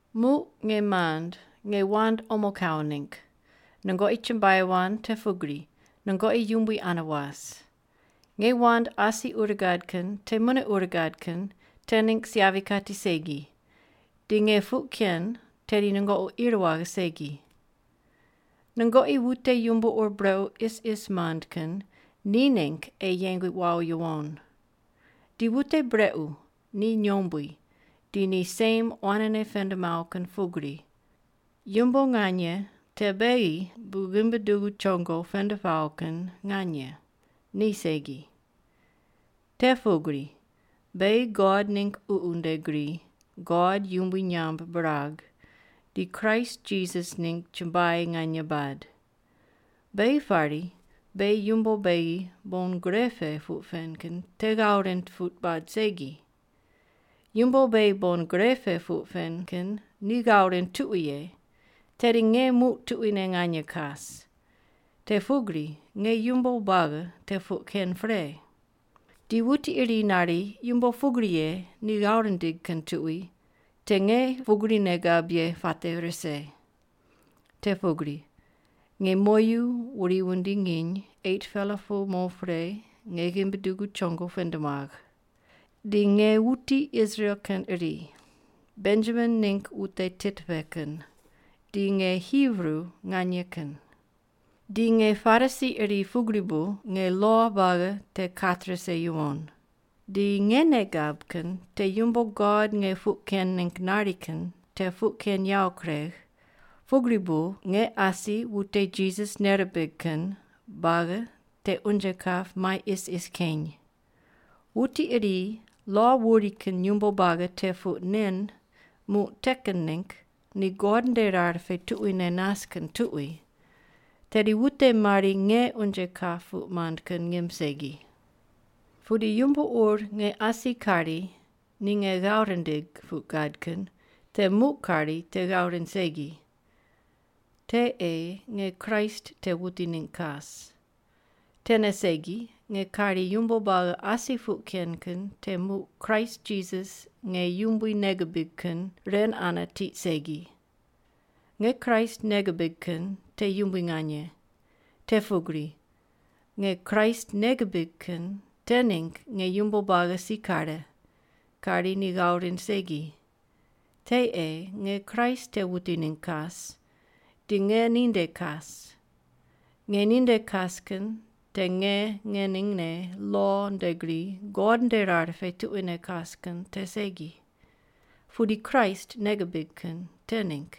Muq, nge mand, nge wand omo kawo ningg, nungoqi chumbuai wand te pugri nungoqi Yumbui ane was. Nge wand asi ur gad kin te mune ur gad kin te ningg si yavi kati segi, di nge puq ken tedi nungoqi ir waghe segi. Nungoqi wute yumbo ur brequ isis mand kin ni ningg ei yeng wawo yuwon. Ni wute brequ, ni nyombui, di ni sem quanene pend mawo kin pugri. Yumbo nganye te beghi bu ghimbi dugu chongo pend pawo kin nganye, ni segi. Te pugri beghi God ningg Ququ nde gri God yumbui nyamb birag di Kraist Jisas ningg chumbuai nganye bad. Beghi pari beghi yumbo beghi bon gre pe puq pen kin te ghav rind puq bad segi. Yumbo beghi bon gre pe puq pen kin ni ghav rind tuqui ye, tedi nge muq tuquine nganye kas. Te pugri nge yumbo buagi te puq ken pre. Di wuti iri nari yumbo pugri ye ni ghav rindig kin tuqui, te nge pugri nei gab ye puate rise. Te pugri nge moyu wuri wundi nginy 8-pela pu mo pre nge ghimbi dugu chongo pend muagh. Di nge wuti Israel kin iri, Benjamin ningg wute tit pe kin, di nge Hibru nganye kin. Di nge Parisi iri pugri bu nge lo buagi te kat rise yuwon. Di nge nei gab kin te yumbo God nge puq ken ningg nari kin te puq ken yawo kuregh, pugri bu nge asi wute Jisas nei rimbig kin buagi te unje kap mai isis keny. Wuti iri lo wuri kin yumbo buagi te puq nen muq te kin ningg ni God nde rar pe tuquine nas kin tuqui, tedi wute mari nge unje kap puq mand kin ngim segi. Pudi yumbo ur nge asi kari ni nge ghav rindigh puq gad kin te muq kari te ghav rind segi, te ei nge Kraist te wuti ningg kas. Tene segi, nge kari yumbo buagi asi puq ken kin te muq Kraist Jisas nge Yumbui nei gibig kin ren ane tiq segi. Nge Kraist nei gibig kin te yumbui nganye. Te pugri nge Kraist nei gibig kin te ningg nge yumbo buagi si kare, kari ni ghav rind segi. Te ei nge Kraist te wuti ningg kas, di nge ninde kas. Nge ninde kas kin te nge ngeningne lo nde gri God nde rar pe tuquine kas kin te segi, pudi Kraist nei gibig kin te ningg.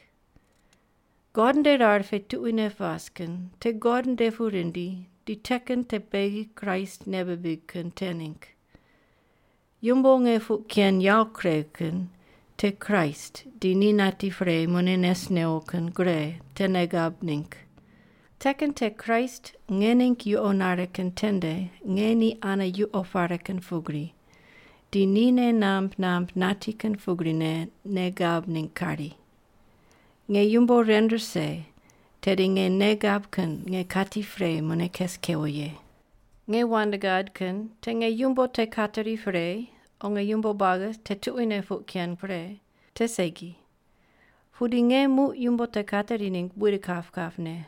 God nde rar pe tuquine pas kin te God nde pu rindi di te kin te beghi Kraist nei bibig kin te ningg. Yumbo nge puq ken yawo kuregh kin te Kraist di ni nati pre mune nes newo kin gre te nei gab ningg. Te kin te Kraist nge ningg yuqo nare kin tende nge ni ane yuqo pare kin pugri, di ni nei namb namb nati kin pugrine nei gab ningg kari. Nge yumbo ren rise tedi nge nei gab kin nge kati pre mune kes kewo ye. Nge wand gad kin te nge yumbo te kateri pre o nge yumbo buagi te tuquine puq ken pre te segi. Pudi nge muq yumbo te kateri ningg buid kap kapne.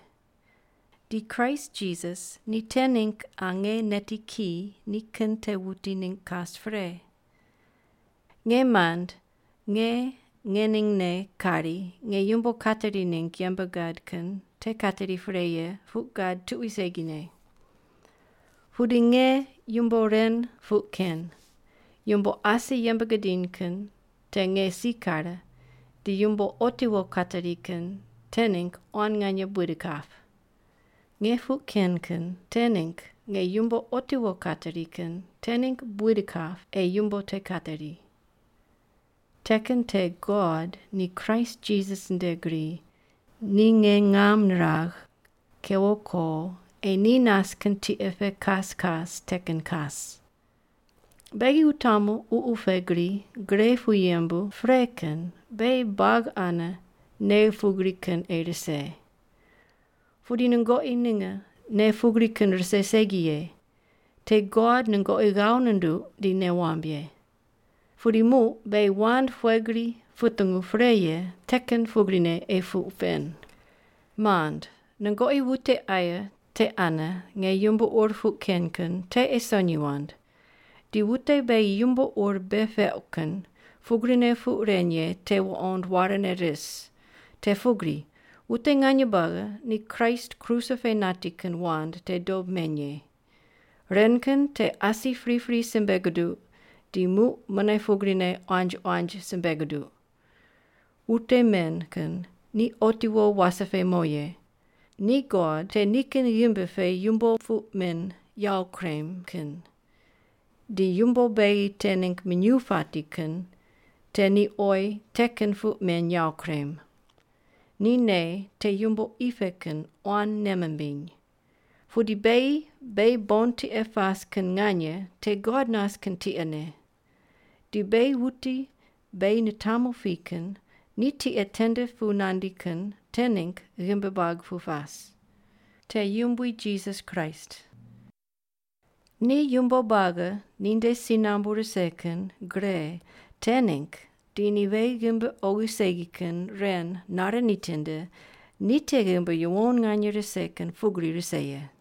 Di Kraist Jisas ni te ningg qa nge neti ki nikin te wuti ningg kas pre. Nge mand nge ngeningne kari nge yumbo kateri ningg yembe gad kin te kateri pre ye puq gad tuqui segine. Pudi nge yumbo ren puq ken: Yumbo asi yembe gidiny kin te nge si kare di yumbo otiwo kateri kin te ningg quan nganye buid kap. Nge puq ken kin te ningg nge yumbo otiwo kateri kin te ningg buid kap ei yumbo te kateri. Te kin te God ni Kraist Jisas nde gri ni nge ngam niragh kewo ko ei ni nas kin tiqe pe kas kas te kin kas. Beghi wutamu ququ pe gri gre pu yembu pre kin beghi buagi ane nei pugri kin ei rise. Pudi nungoqi ninge nei pugri kin rise segi ye, te God nungoqi ghav nunduq di nei wamb ye. Pudi muq beghi wand pughe gri putungu pre ye te kin pugrine ei puq pen. Mand, nungoqi wute aye te ane nge yumbo ur puq ken kin te ei sonyi wand, di wute beghi yumbo ur bei peuq kin pugrine puq ren ye te wuqond warene ris. Te pugri wute nganye buagi ni Kraist kruse pe nati kin wand te dob meny ye. Ren kin te asi pripri simbe guduq di muq mune pugrine quanji quanji simbe guduq. Wute men kin ni otiwo wase pe mo ye. Ni god te nikin ghimbi pe yumbo puq men yawo kurem kin, di yumbo beghi te ningg minyuw pati kin te ni oyi te kin puq men yawo kurem. Ni nei te yumbo qi pe kin quan nei mimbiny. Pudi beghi beghi bon tiqe pas kin nganye te God nas kin tiqene. Di beghi wuti beghi nitamu pi kin ni tiqe tende pu nandi kin te ningg ghimbi buag pu pas. Te Yumbui Jisas Kraist. Ni yumbo buagi ninde si nambu rise kin gre te ningg di ni beghi ghimbi oghi segi kin ren nare nitinde ni te ghimbi yuwon nganye rise kin pugri rise ye.